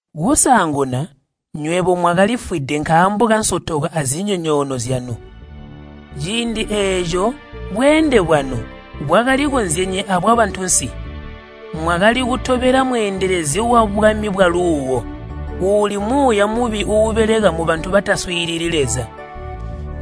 Kusaanguna nywebo mwakalifwide nkaambo kansotoko azinyonyoono zyanu. Ciindi eeco bweende bwanu bwakalikozyenye abwabantunsi. Mwakali kutobela mweendelezi wabwami bwaluuwo, uuli muuya mubi uubeleka mubantu bataswiilili Leza.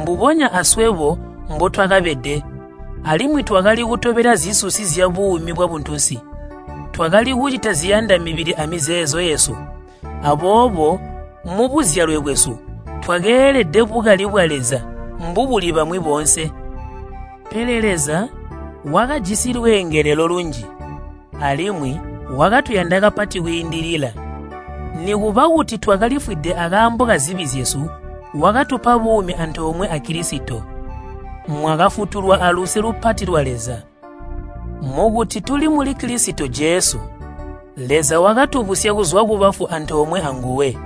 Mbubonya aswebo mbotwakabede, alimwi twakali kutobela zisusi zyabuumi bwabuntunsi. Twakali kucita ziyanda mibili amizeezo yesu. Aboobo mubuzyalwe bwesu twakeelede bukali bwa Leza mbubuli bamwi boonse. Pele Leza wakajisi lweengelelo lunji, alimwi wakatuyanda kapati kwiindilila. Nikuba kuti twakalifwide akaambo kazibi zyesu, wakatupa buumi antoomwe a Kilisito. Mwakafutulwa aluse lupati lwa Leza. Mukuti tuli muli Kilisito Jesu, Leza wakatubusya kuzwa kubafu antoomwe anguwe,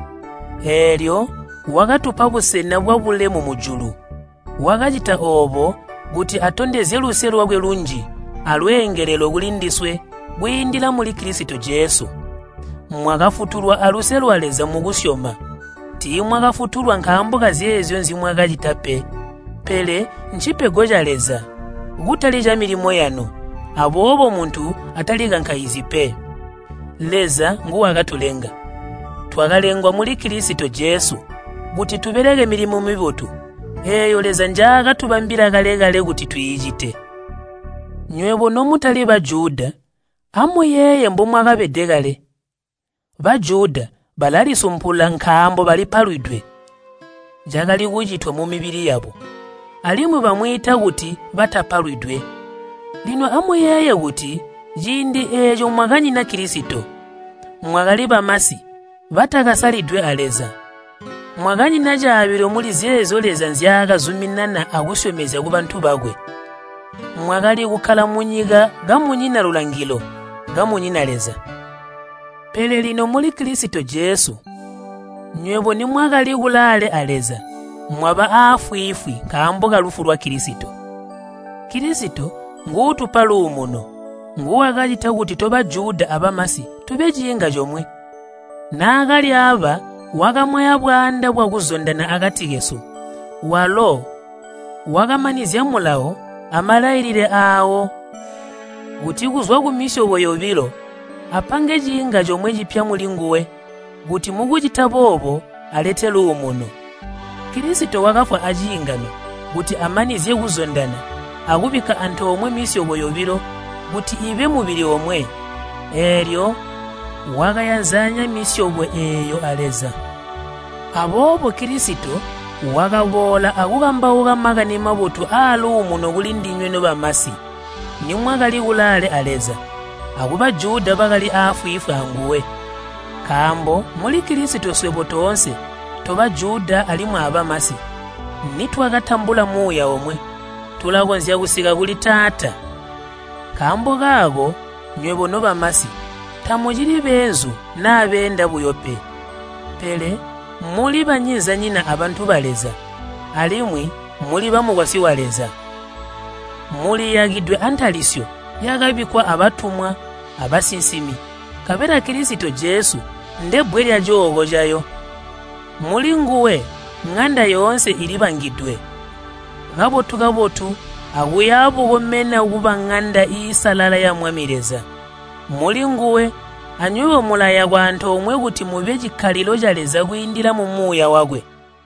eelyo wakatupa busena bwabulemu mujulu. Wakacita oobo kuti atondezye luse lwakwe lunji alweengelelo kulindiswe kwiindila muli Kilisito Jesu. Mwakafutulwa aluse lwa Leza mukusyoma. Tiimwakafutulwa nkaambo kazeezyo nzimwakacita pe. Pele ncipego ca Leza, kutali camilimo yanu, aboobo muntu atalikankaizyi pe. Leza nguwakatulenga. Twakalengwa muli Kilisito Jesu kuti tubeleke milimo mibotu, eeyo Leza njaakatubambila kale-kale kuti twiicite. Nywebo nomutali Bajuda amuyeeye mbomwakabede kale. Bajuda balalisumpula nkaambo balipalwidwe, (cakali kucitwa mumibili yabo) alimwi bamwiita kuti batapalwidwe. Lino amuyeeye kuti ciindi eeco mwakanyina Kilisito. Mwakali bamasi batakasalidwe a Leza. Mwakanyina caabilo muli zeezyo Leza nzyaakazuminana akusyomezya kubantu bakwe. Mwakali kukkala munyika kamunyina lulangilo, kamunyina Leza. Pele lino muli Kilisito Jesu, nywebo nimwakali kulaale a Leza, mwaba aafwiifwi nkaambo kalufu lwa Kilisito. Kilisito nguutupa luumuno, nguwakacita kuti to Bajuda abamasi tube ciinga comwe. Naakalyaaba wakamwaya bwaanda bwakuzondana akati kesu. Walo wakamanizya Mulawo amalailile aawo, kuti kuzwa kumisyobo yobilo apange ciinga comwe cipya mulinguwe kuti mukucita boobo alete luumuno. Kilisito wakafwa aciingano kuti amanizye kuzondana akubikka antoomwe misyobo yobilo kuti ibe mubili omwe. Eelyo wakayanzanya misyobo eeyo a Leza. Aboobo Kilisito wakaboola akukambauka Makani Mabotu aaluumuno kulindinywe nobamasi, nimwakali kulaale a Leza, aku Bajuda bakali aafwiifwi anguwe. Nkaambo muli Kilisito swebo toonse, to Bajuda alimwi abamasi, nitwakatambula Muuya omwe, tulakonzya kusika kuli Taata. Nkaambo kaako nywebo nobamasi tamucili beenzu naa beenda buyo pe, pele muli banyinzinyina abantu ba Leza alimwi muli bamukwasyi wa Leza. Muliyakidwe antalisyo yakabikkwa abatumwa abasinsimi nkabela Kilisito Jesu ndebbwe lyacooko cayo. Mulinguwe ŋanda yoonse ilibangidwe kabotu-kabotu akuya bukomena kuba ŋanda iisalala ya Mwami Leza. Mulinguwe anywebo mulayakwa antoomwe kuti mube cikkalilo ca Leza kwiindila mu Muuya wakwe.